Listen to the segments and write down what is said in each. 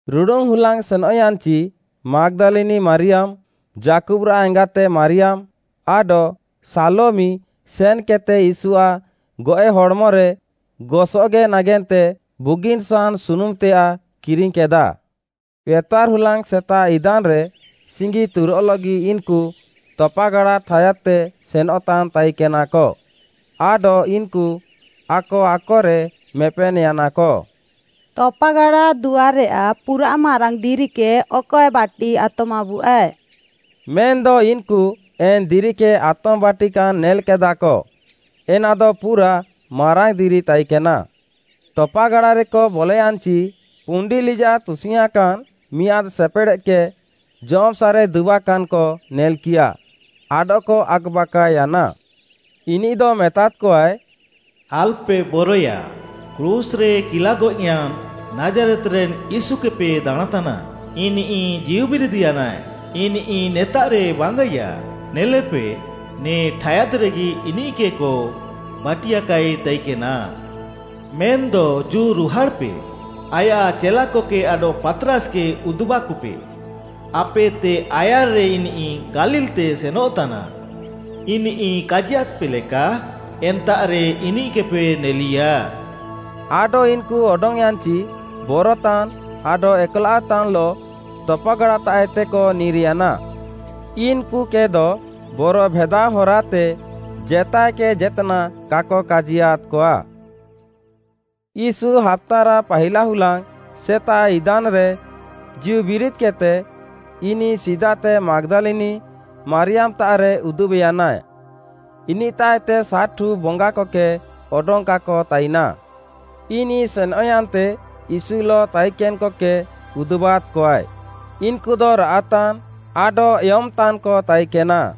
ରୁଡ଼ୁନ୍‌ ହୁଲାଙ୍ଗ୍‌ ସେନଃୟାନ୍‍ଚି ମାଗ୍‌ଦାଲିନି ମାରିୟାମ୍‌, ଯାକୁବ୍‌ରାଃ ଏଙ୍ଗାତେ ମାରିୟାମ୍‌, ଆଡଃ ସାଲୋମି ସେନ୍‌କେଦ୍‌ତେ ୟୀଶୁଆଃ ଗଏଃ ହଡ଼୍‌ମରେ ଗସଗେ ନାଗେନ୍ତେ ବୁଗିନ୍‌ ସହାନ୍‌ ସୁନୁମ୍‌ତେୟାଃ କିରିଙ୍ଗ୍‌କେଦାଃ। ଏତଆର୍‌ ହୁଲାଙ୍ଗ୍‌ ସେତାଃ ଇଦାନ୍‍ରେ ସିଙ୍ଗି ତୁରଃଲଃଗି ଇନ୍‌କୁ ତପାଗାଡ଼ା ଠାୟାଦ୍‌ତେ ସେନଃତାନ୍‌ ତାଇକେନାକ, ଆଡଃ ଇନ୍‌କୁ ଆକ ଆକରେ ମେପେନ୍‌ୟାନାକ, “ତପାଗାଡ଼ା ଦୁଆର୍‌ରେୟାଃ ପୁରାଃ ମାରାଙ୍ଗ୍‌ ଦିରିକେ ଅକଏ ବାଟିଆତମାବୁଆଏ?” ମେନ୍‌ଦ ଇନ୍‌କୁ ଏନ୍‌ ଦିରିକେ ଆତମ୍‍ବାଟିକାନ୍ ନେଲ୍‍କେଦାକ, ଏନାଦ ପୁରାଃ ମାରାଙ୍ଗ୍‌ ଦିରି ତାଇକେନା। ତପାଗାଡ଼ାରେକ ବଲୟାନ୍‍ଚି, ପୁଣ୍ଡି ଲିଜାଃ ତୁସିଙ୍ଗ୍‌ଆଁକାନ୍‌ ମିଆଁଦ୍‌ ସେପେଡ଼େଦ୍‍କେ ଜମ୍‍ସାଃରେ ଦୁବାକାନ୍‍କ ନେଲ୍‌କିୟାଃ, ଆଡଃକ ଆକ୍‌ବାକାଅୟାନା। ଇନିଃଦ ମେତାଦ୍‌କଆଏ, “ଆଲ୍‌ପେ ବରଏୟା, କ୍ରୁଶ୍‌ରେ କିଲାଗଏଃୟାନ୍‌ ନାଜ୍‌ରେତ୍‌ରେନ୍‌ ୟୀଶୁକେପେ ଦାଣାଁଁତାନା, ଇନିଃ ଜୀଉବିରିଦ୍‌ୟାନାଏ, ଇନିଃ ନେତାଃରେ ବାଙ୍ଗାଇୟା। ନେଲେପେ, ନେ ଠାୟାଦ୍‍ରେଗି ଇନିଃକେକ ବାଟିଆକାଇ ତାଇକେନା। ମେନ୍‌ଦ ଜୁ ରୁହାଡ଼୍‌ପେ, ଆୟାଃ ଚେଲାକକେ ଆଡଃ ପାତ୍‌ରାସ୍‌କେ ଉଦୁବାକପେ, ଆପେଏତେ ଆୟାର୍‌ରେ ଇନିଃ ଗାଲିଲ୍‌ତେ ସେନଃତାନା, ଇନିଃ କାଜିୟାଦ୍‍ପେ ଲେକା ଏନ୍ତାଃରେ ଇନିଃକେପେ ନେଲିୟା।” ଆଡଃ ଇନ୍‌କୁ ଅଡଙ୍ଗ୍‌ୟାନ୍‌ଚି ବରତାନ୍‌ ଆଡଃ ଏକ୍‌ଲାଅଃତାନ୍‌ଲଃ ତପାଗାଡ଼ାତାଃଏତେକ ନିର୍‌ୟାନା। ଇନ୍‍କୁକେଦ ବରଭେଦାଅ ହରାତେ ଜେତାଏକେ ଜେତ୍‌ନାଃ କାକ କାଜିୟାଦ୍‍କଆ। ୟୀଶୁ ହାପ୍ତାରାଃ ପାହିଲାହୁଲାଙ୍ଗ୍‌ ସେତାଃଇଦାନ୍‍ରେ ଜୀଉବିରିଦ୍‍କେଦ୍‌ତେ, ଇନିଃ ସିଦାତେ ମାଗ୍‌ଦାଲିନି ମାରିୟାମ୍‌ତାଃରେ ଉଦୁବେନ୍‍ୟାନା, ଇନିଃତାଃଏତେ ସାତ୍‌ଠୁ ବଙ୍ଗାକକେ ଅଡଙ୍ଗ୍‌କାକ ତାଇନା। ଇନିଃ ସେନ୍‍ୟାନ୍ତେ ୟୀଶୁଲଃ ତାଇକେନ୍‍କକେ ଉଦୁବାଦ୍‌କଆଏ। ଇନ୍‍କୁଦ ରାଆଃତାନ୍ ଆଡଃ ଏୟମ୍‍ତାନ୍‍କ ତାଇକେନା।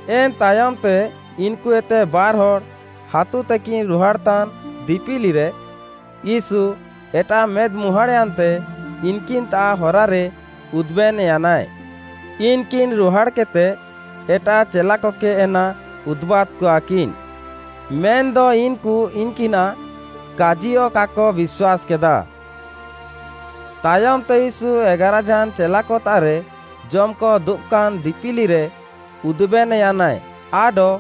ଏନ୍‌ ତାୟମ୍‌ତେ, ଇନ୍‌କୁଏତେ ବାର୍‌ହଡ଼୍‌, ହାତୁତେକିନ୍ ରୁହାଡ଼୍‌ତାନ୍ ଦିପିଲିରେ, ୟୀଶୁ, ଏଟାଃ ମେଦ୍‍ମୁହାଁଡ଼୍‌ୟାନ୍ତେ ଇନ୍‌କିନ୍‌ତାଃ ହରାରେ ଉଦୁବେନ୍‍ୟାନାଏ। ଇନ୍‌କିନ୍‌ ରୁହାଡ଼୍‌କେଦ୍‌ତେ ଏଟାଃ ଚେଲାକକେ ଏନା ଉଦୁବାଦ୍‍କଆକିନ୍, ମେନ୍‌ଦ ଇନ୍‌କୁ ଇନ୍‌କିନାଃ କାଜିୟଃ କାକ ବିଶ୍ୱାସ୍‌କେଦାଃ। ତାୟମ୍‌ତେ ୟୀଶୁ ଏଗାରାଝାନ୍‌ ଚେଲାକତାଃରେ ଜମ୍‌କ ଦୁବାକାନ୍‌ ଦିପିଲିରେ ଉଦୁବେନ୍‍ୟାନାଏ ଆଡଃ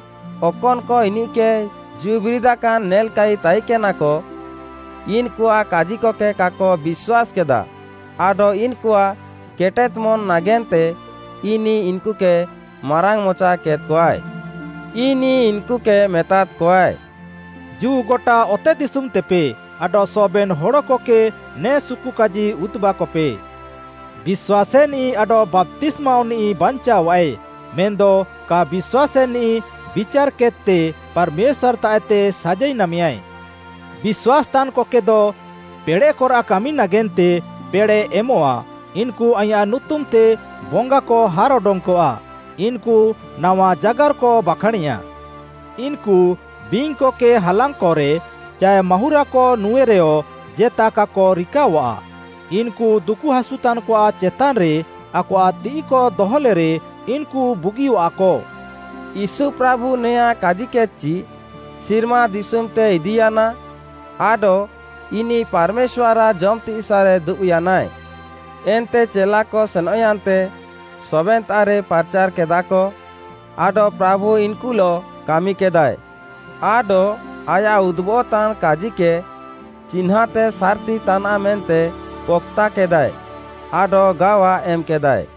ଅକନ୍‌କ ଇନିଃକେ ଜୀଉବିରିଦାକାନ୍ ନେଲ୍‍କାଇ ତାଇକେନାକ, ଇନ୍‌କୁଆଃ କାଜିକକେ କାକ ବିଶ୍ୱାସ୍‌କେଦା ଆଡଃ ଇନ୍‌କୁଆଃ କେଟେଦ୍‌ମନ୍‍ ନାଗେନ୍ତେ ଇନିଃ ଇନ୍‌କୁକେ ମାରାଙ୍ଗ୍‌ମଚାକେଦ୍‍କଆଏ। ଇନିଃ ଇନ୍‌କୁକେ ମେତାଦ୍‌କଆଏ, “ଜୁ ଗଟା ଅତେଦିଶୁମ୍‌ତେପେ ଆଡଃ ସବେନ୍‌ ହଡ଼କକେ ନେ ସୁକୁକାଜି ଉଦୁବାକପେ। ବିଶ୍ୱାସେନିଃ ଆଡଃ ବାପ୍ତିସ୍ମାଅଃନିଃ ବାଞ୍ଚାଅଃଆଏ, ମେନ୍‌ଦ କା ବିଶ୍ୱାସେନିଃ ବିଚାର୍‌କେଦ୍‌ତେ ପାର୍‌ମେଶ୍ୱାର୍‌ତାଃଏତେ ସାଜାଇ ନାମେୟାଏ। ବିଶ୍ୱାସ୍‌ତାନ୍‌କକେଦ ପେଡ଼େଃକରାଃ କାମି ନାଗେନ୍ତେ ପେଡ଼େଃ ଏମଃଆ; ଇନ୍‌କୁ ଆଇଁୟାଃ ନୁତୁମ୍‌ତେ ବଙ୍ଗାକ ହାର୍‌ଅଡଙ୍ଗ୍‌କଆ, ଇନ୍‌କୁ ନାୱା ଜାଗାର୍‌କ ବାଖାଁଣେଆ। ଇନ୍‌କୁ ବିଙ୍ଗ୍‌କକେ ହାଲାଙ୍ଗ୍‌କରେ ଚାଏ ମାହୁଁରାକ ନୁଁଏରେଅଃ ଜେତାକାକ ରିକାଅଆଃ, ଇନ୍‌କୁ ଦୁକୁହାସୁତାନ୍‌କଆଃ ଚେତାନ୍‌ରେ ଆକଆଃ ତିଃଇକ ଦହଲେରେ, ଇନ୍‌କୁ ବୁଗିଅଃଆକ।” ୟୀଶୁ ପ୍ରାଭୁ ନେଆଁଁ କାଜିକେଦ୍‌କଚି, ସିର୍ମା ଦିଶୁମ୍‌ତେ ଇଦିୟାନା ଆଡଃ ଇନିଃ ପାର୍‌ମେଶ୍ୱାର୍‌ଆଃ ଜମ୍‌ତିସାଃରେ ଦୁବ୍‌ୟାନାଏ। ଏନ୍ତେ ଚେଲାକ ସେନଃୟାନ୍ତେ ସବେନ୍‌ତାଃରେ ପାର୍‌ଚାର୍‌କେଦାଃକ, ଆଡଃ ପ୍ରାଭୁ ଇନ୍‌କୁଲଃ କାମିକେଦାଏ ଆଡଃ ଆୟାଃ ଉଦୁବଃତାନ୍‌ କାଜିକେ ଚିହ୍ନାଁତେ ସାର୍‌ତି ତାନାଃ ମେନ୍ତେ ପକ୍‌ତାକେଦାଏ ଆଡଃ ଗାୱା ଏମ୍‌କେଦାଏ।